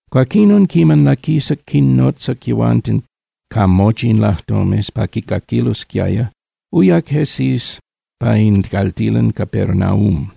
Cuaquinon, quiman laquisac quinnotzac yehuanten ca mochi in lajtomes pa quicaquilosquiaya, uyac Jesús pa in caltilan Capernaúm.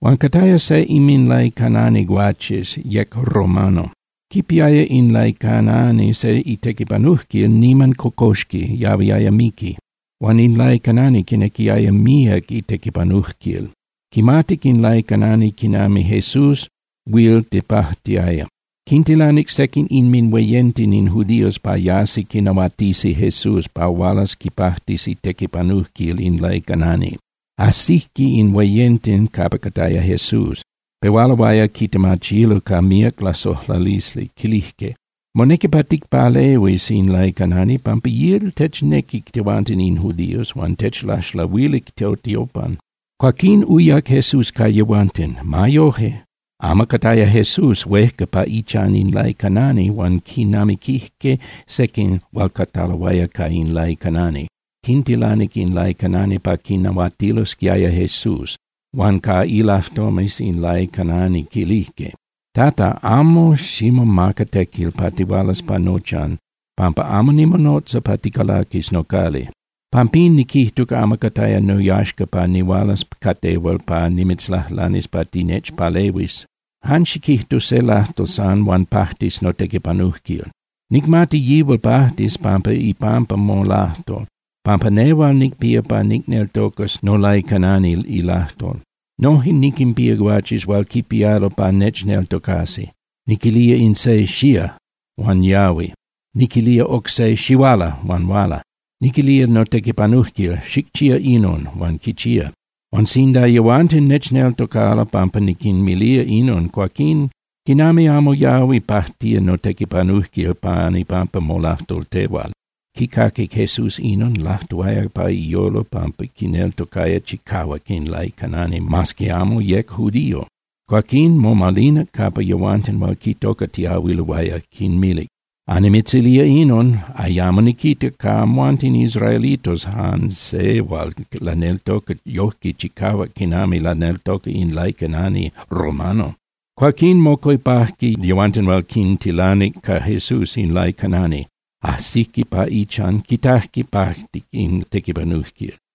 Huan cataya se inminlaicanani guaches, yec romano. Quipiaya in laicanani se itequipanujquil niman cocoxqui, yahuiaya miqui. Huan in laicanani quinequiaya míac itequipanujquil. Quimatic in laicanani quinami Jesús huil tepajtiaya, quintilanic sequin inminhueyenten in judíos pa yasi quinahuatisi Jesús pa hualas quipajtis itequipanujquil in laicanani. Ajsijque in hueyenten capa cataya Jesús, pehualoaya quitemachilo ca míac lasojlalisli, quilijque: —Monequi pa ticpalehuis in laicanani pampa yihual technequi tehuanten in judíos huan techlaxlahuilic totiopan. Cuaquín uyac Jesús ca yehuanten. Ma yoje, amo cataya Jesús huejca pa ichan in laicanani huan quinamiquijque sequin hual cataloaya ca in laicanani, quintilanic in laicanani pa quinahuatilosquiaya Jesús, huan ca ilajtomes in laicanani quilijque: —Tata, amo ximomaca tequil pa tihualas pa nochan pampa amo nimonotza pa ticalaquis nocali. Pampín niquijtuc amo cataya noyaxca pa nihualas ca tehual pa nimitzlajlanis pa tinechpalehuis. Jan xiquijtu se lajtol san huan pajtis notequipanujquil. Nicmati yihual pajtis pan ipampa molajtol, pampa nehual nicpía pa nicneltocas nolaicanani ilajtol. Noje niquinpía guaches hual quipialo pa nechneltocasi. Niquilía in se “¡Xía!” huan yahui, niquilía oc se “¡Xihuala!” huan huala. Niquilía notequipanujquil “¡Xicchía inon!” huan quichía. Huan sinda yehuanten nechneltocalo pampa niquinmilía inon, cuaquín ¡quinami amo yahui pajtía notequipanujquil pan ipampa molajtol tehual! Quicaquic Jesús inon, lajtuaya pa iyolo pampa quineltocaya chicahuac in laicanani mas que amo yec judío. Cuaquín, momalinac capa yehuanten hual quitocatiahuiloaya, quinmilic: —Annimitzilía inon. Ayamo niquitac ca amhuanten israelitos jan se hual laneltoca yojque chicahuac quinami laneltoca in laicanani romano. Cuaquín, mocuepajque yehuanten hual quintilanic ca Jesús in laicanani. Ajsijque pa ichan, quitajque pajtic in tequipanujquil.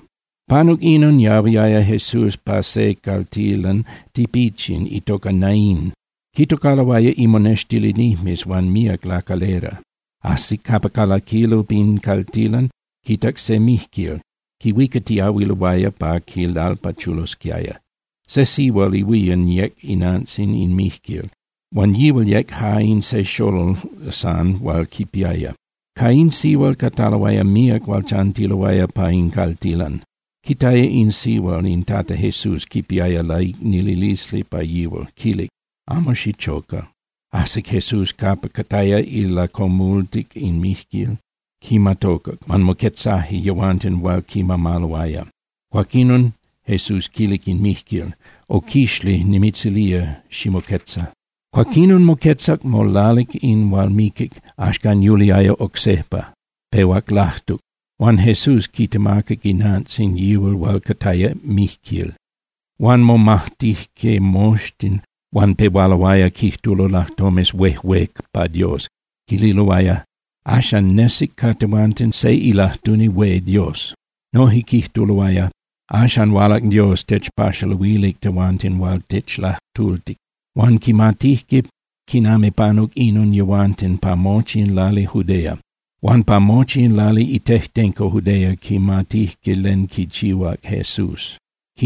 Panuc inon, yahuiaya Jesús pa se caltilan tipichin itoca Naín, quitocaloaya imonextilinijmes huan míac lacalera. Ajsic capa calaquilo pin caltilan, quitac se mijquil, quihuicatiahuiloaya pa quilalpachulosquiaya. Se sihual ihuían yec inantzin in mijquil, huan yihual yec ja in se xolol san hual quipiaya. Ca in sihual cataloaya míac hual chantiloaya pa in caltilan. Quitaya in sihual, in Tata Jesús quipiaya laicnililisli pa yihual, quilic: —Amo xichoca. Ajsic Jesús capa cataya ilacomultic in mijquil, quimatocac, huan moquetzaje yehuanten hual quimamaloaya. Cuaquinon Jesús quilic in mijquil: —Oquixli, nimitzilía ximoquetza. Cuaquinon moquetzac molalic in hual miquic, axcan yuliaya oc sejpa, pehuac lajtuc. Huan Jesús quitemacac inantzin yihual hual cataya mijquil. Huan momajtijque moxtin huan pehualoaya quijtulo lajtomes huejué pa Dios, quililoaya: —Axcan nesic ca tehuanten se ilajtuni hué Dios. Noje quijtuloaya: —Axcan hualac Dios techpaxaluilic tehuanten hual techlajtultic. Huan quimatijque quinami panuc inon yehuanten pa mochi in lali Judea. Huan pa mochi in lali itejtenco Judea quimatijque len quichihuac Jesús.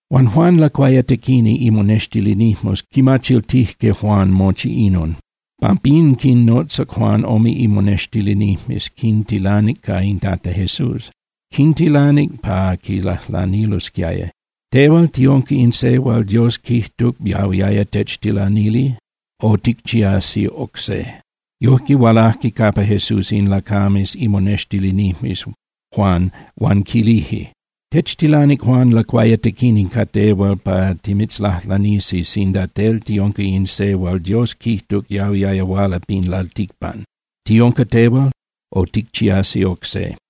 Huan Juan Lacuayatequini imonextilinijmes quimachiltijque Juan mochi inon. Pampín quinnotzac Juan ome imonextilinijmes, quintilanic ca in Tata Jesús. Quintilanic pa quilajlanilosquiaya: —¿Tehual tiunca in se hual Dios quijtuc yahuiaya techtilanili? O ¿ticchiasi oc se? Yojque hualajque capa Jesús in lacames imonextilinijmes Juan huan quilije: —Techtilanic Juan Lacuayatequini ca tehual pa timitzlajlanisi sinda tel tiunca in se hual Dios quijtuc yahuiaya huala pin lalticpan. ¿Tiunca tehual o ticchiasi oc se?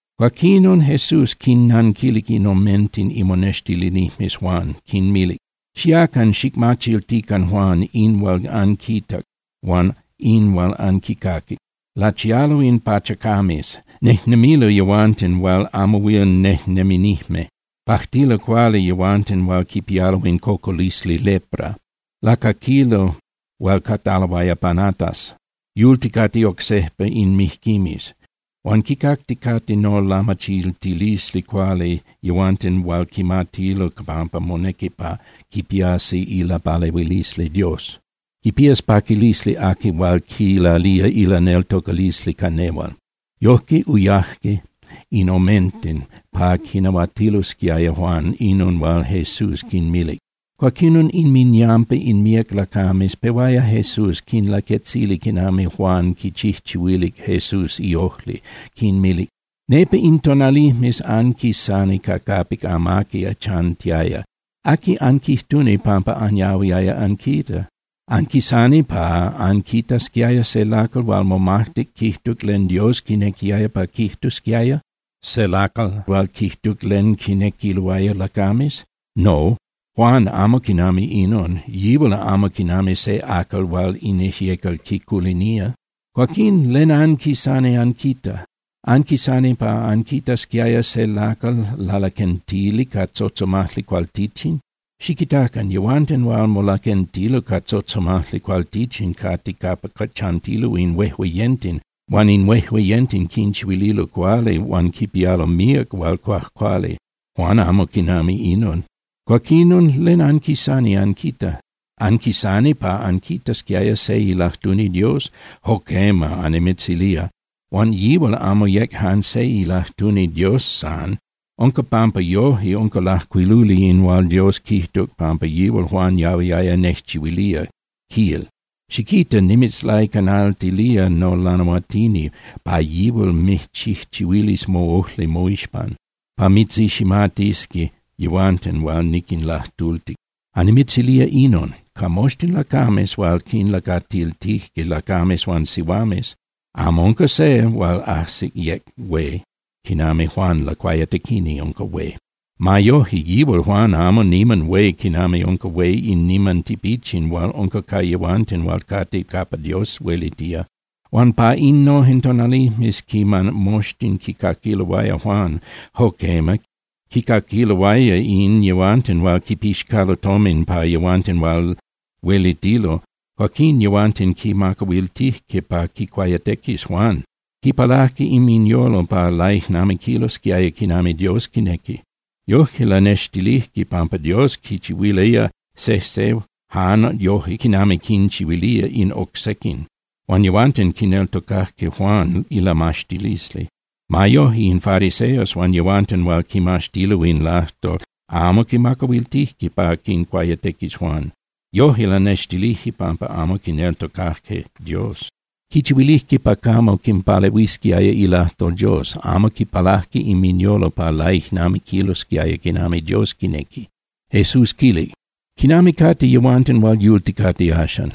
Cuaquinon Jesús quinnanquilic in omenten imonextilinijmes Juan, quinmilic: —Xiacan xicmachiltican Juan in hual anquitac huan in hual anquicaquic: Lachialo in pachacames, nejnemilo yehuanten hual amo huil nejneminijme. Pajtilo cuali yehuanten hual quipialo in cocolisli lepra. Lacaquilo hual cataloaya panatas. Yulticate oc sejpa in mijquimes. Huan quicacticate nolamachiltilisli cuali yehuanten hual quimatilo pampa monequi pa quipiasi ilapalehuilisli Dios. Quipías paquilisli aqui hual quilalía ilaneltocalisli ca nehual. Yojque uyaje in omenten pa quinahuatilosquiaya Juan inon hual Jesús quinmilic. Cuaquinon inminyampa in míac lacames pehuaya Jesús quinlaquetzili quinami Juan quichijchihuilic Jesús iojli, quinmilic: —Nepa in tonalijmes anquisani ca capic amaqui chantiaya. ¿Aqui anquijtuni pampa anyahuiaya anquita? ¿Anquisani pa anquitasquiaya se lacal hual momajtic quijtuc len Dios quinequiaya pa quijtusquiaya, se lacal hual quijtuc len quinequiloaya lacames? No, Juan amo quinami inon, yihual amo quinami se acal hual in ijyecal quiculinía. Cuaquín ¿len anquisani anquita? ¿Anquisani pa anquitasquiaya se lacal lalaquentili ca tzotzomajli cualtichin? Xiquitacan. Yehuanten hual molaquentilo ca tzotzomajli cualtichin cate capa chantilo in huejueyenten huan in huejueyenten quinchihuililo cuali huan quipialo míac hual cuajcuali. Juan amo quinami inon. Cuaquinon ¿len anquisani anquita? ¿Anquisani pa anquitasquiaya se ilajtuni Dios? Jo quema, annimitzilía. Huan yihual amo yec jan se ilajtuni Dios san. Unca pampa yoje unca lajcuiluli in hual Dios quijtuc pampa yihual Juan yahuiaya nejchihuilía, quil: Xiquita, nimitzlaicanaltilía nolanahuatini pa yihual mijchijchihuilis moꞌojli moixpan, pa mitziximatisqui yehuanten hual niquinlajtultic. Annimitzilía inon. Ca moxtin lacames hual quinlacatiltije lacames huan sihuames, amo unca se hual ajsic yec hué quinami Juan Lacuayatequini unca hué. Ma yoje, yihual Juan amo niman hué quinami unca hué in niman tipichin hual unca ca yehuanten hual cate capa Dios huelitía. Huan pa innojen tonalijmes quiman moxtin quicaquiloaya Juan, jo quema, quicaquiloaya in yehuanten hual quipixcalo tomin pa yehuanten hual huelitilo, cuaquín yehuanten quimacahuiltijque pa quincuayatequis Juan. Quipalajque inminyolo pa laijnamiquilosquiaya quinami Dios quinequi. Yoje lanextilijque pampa Dios quinchihuilía sejse jan yoje quinami quinchihuilía in oc sequin. Huan yehuanten quineltocajque Juan ilamaxtilisli. Ma yoje, in fariseos huan yehuanten hual quimaxtilo in lajtol amo quimacahuiltijque pa quincuayatequis Juan. Yoje lanextilijque pampa amo quineltocajque Dios. Quichihuilijque pa camo quinpalehuisquiaya ilajtol Dios, amo quipalajque inminyolo pa laijnamiquilosquiaya quinami Dios quinequi. Jesús quilic: —¿Quinami cate yehuanten hual yulticate axan?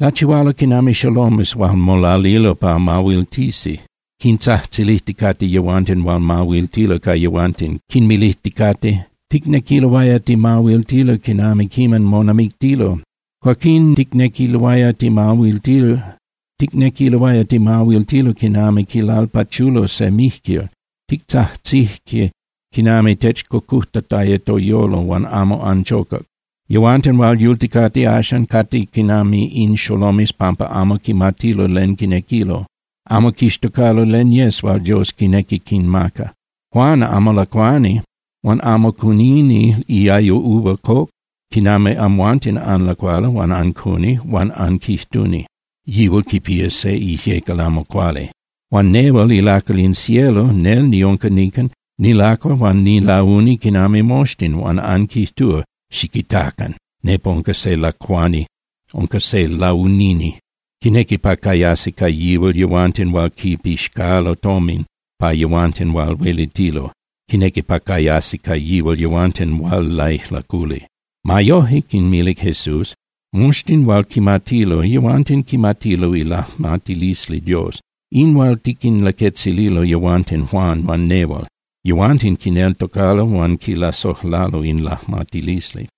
Lachihualo quinami xolomes hual molalilo pa mahuiltisi. Quintzajtzilijticate yehuanten hual mahuiltilo ca yehuanten, quinmilijticate: “Ticnequiloaya timahuiltilo quinami quiman monamictilo. Antimijtzotzonilije huan amo anmijtotic. Cuaquín ticnequiloaya timahuiltilo quinami quilalpachulo se mijquil, titzajtzije quinami techcocujtataya toyolo huan amo anchocac.” Yehuanten hual yulticate axan cate quinami in xolomes pampa amo quimatilo len quinequilo. Amo quixtocalo len yes hual Dios quinequi quinmaca. Juan amo lacuani huan amo cunini iayo uva coc quinami amhuanten anlacualo huan ancuni huan anquijtuni: “Yihual quipía se ijyecal amo cuali.” Huan nehual ilacal in cielo, nel niunca nican, nilacua huan nilauni quinami moxtin, huan anquijtúa: “Xiquitacan. Nepa unca se lacuani, unca se launini. Quinequi pa cayasi ca yihual yehuanten hual quipixcalo tomin pa yehuanten hual huelitilo. Quinequi pa cayasi ca yihual yehuanten hual laijlaculi.” Ma yoje —quinmilic Jesús—, moxtin hual quimatilo, yehuanten quimatilo ilajmatilisli Dios, in hual tiquinlaquetzililo yehuanten Juan huan nehual. Yehuanten quineltocalo huan quilasojlalo in lajmatilisli.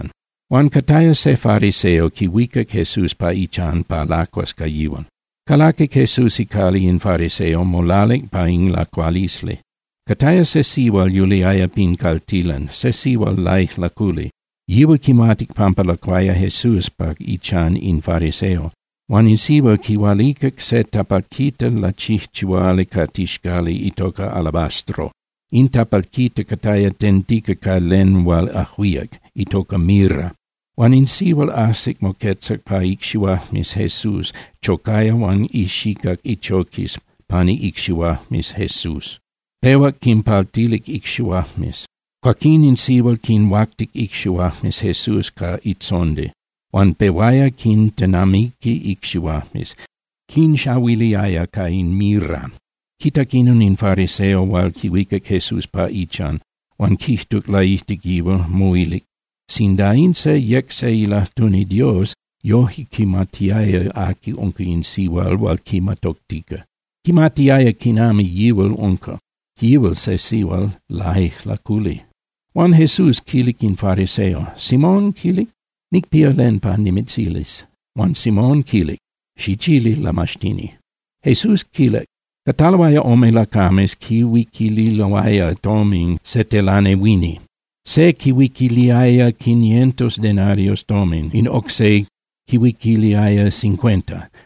Huan cataya se fariseo quihuicac Jesús pa ichan pa lacuas ca yihual. Calaquic Jesús icali in fariseo, molalic pa in lacualisli. Cataya se sihual yuliaya pin caltilan, se sihual laijlaculi. Yihual quimatic pampa lacuaya Jesús pa ichan in fariseo. Huan in sihual quihualicac se tapalquita lachijchihuali ca tixcali itoca alabastro. In tapalquita cataya tentica ca len hual ajuíac, itoca mirra. Huan in sihual ajsic moquetzac pa icxihuajmes Jesús, chocaya huan ixicac ichoquis pani icxihuajmes Jesús, pehuac quinpaltilic icxihuajmes. Cuaquín in sihual quinhuactic icxihuajmes Jesús ca itzondi, huan pehuaya quintenamiqui icxihuajmes, quinxahuiliaya ca in mirra. Quitac inon in fariseo hual quihuicac Jesús pa ichan, huan quijtuc laijtic yihual, moilic: “Sinda in se yec se ilajtuni Dios, yoje quimatiaya aqui unca in sihual hual quimatoctica. Quimatiaya quinami yihual unca, yihual se sihual laijlaculi.” Huan Jesús quilic in fariseo: —Simón —quilic—, nicpía len pa nimitzilis. Huan Simón quilic: —Xichili, Lamaxtini. Jesús quilic: —Cataloaya ome lacames quihuiquililoaya tomin se telanehuini. Se quihuiquiliaya quinientos denarios tomin, in oc se quihuiquiliaya cincuenta.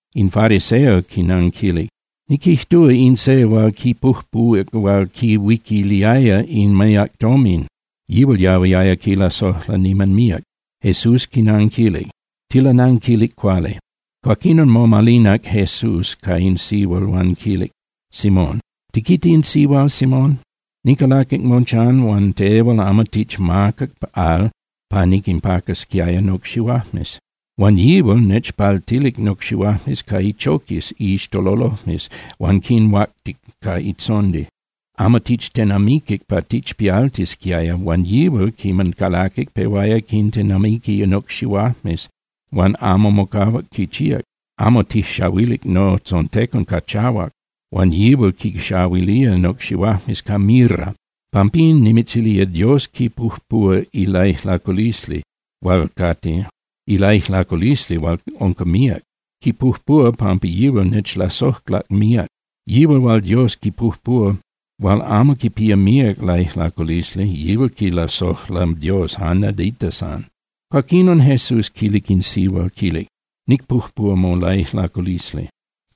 In fariseo quinanquilic: —Niquijtúa in se hual quipujpuhuac hual quihuiquiliaya in míac tomin, yihual yahuiaya quilasojla niman míac. Jesús quinanquilic: —Tilananquilic cuali. Cuaquinon momalinac Jesús ca in sihual huan quilic Simón: —¿Tiquita in sihual, Simón? Nicalaquic mochan huan tehual amo tichmacac al pa niquinpacasquiaya nocxihuajmes. Huan yihual nechpaltilic nocxihuajmes ca ichoquis iixtololojmes huan quinhuactic ca itzondi. Amo tichtenamiquic pa tichpialtisquiaya, huan yihual quiman calaquic pehuaya quintenamiqui nocxihuajmes huan amo mocahuac quichíac. Amo tijxahuilic notzontecon ca chahuac, huan yihual quinxahuilía nocxihuajmes ca mirra. Pampín nimitzilía, Dios quipujpuhua ilaijlaculisli hual unca míac. Quipujpuhua pampa yihual nechlasojlac míac. Yihual hual Dios quipujpuhua hual amo quipía míac laijlaculisli, yihual quilasojla Dios jan nadita san. Cuaquinon Jesús quilic in sihual, quilic: —Nicpujpúa molaijlaculisli.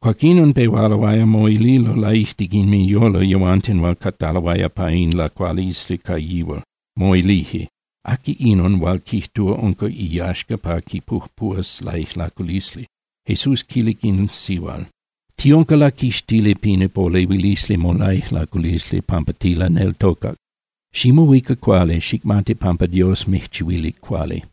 Cuaquinon pehualoaya moililo laijtic inminyolo yehuanten hual cataloaya pa in lacualisli ca yihual, moilije: “¿Aqui inon hual quijtúa unca iyaxca pa quipujpuhuas laijlaculisli?” Jesús quilic in sihual: —Tiunca laquixtili pin ipolehuilisli molaijlaculisli pampa tilaneltocac. Ximohuica cuali, xicmati pampa Dios mijchihuilic cuali.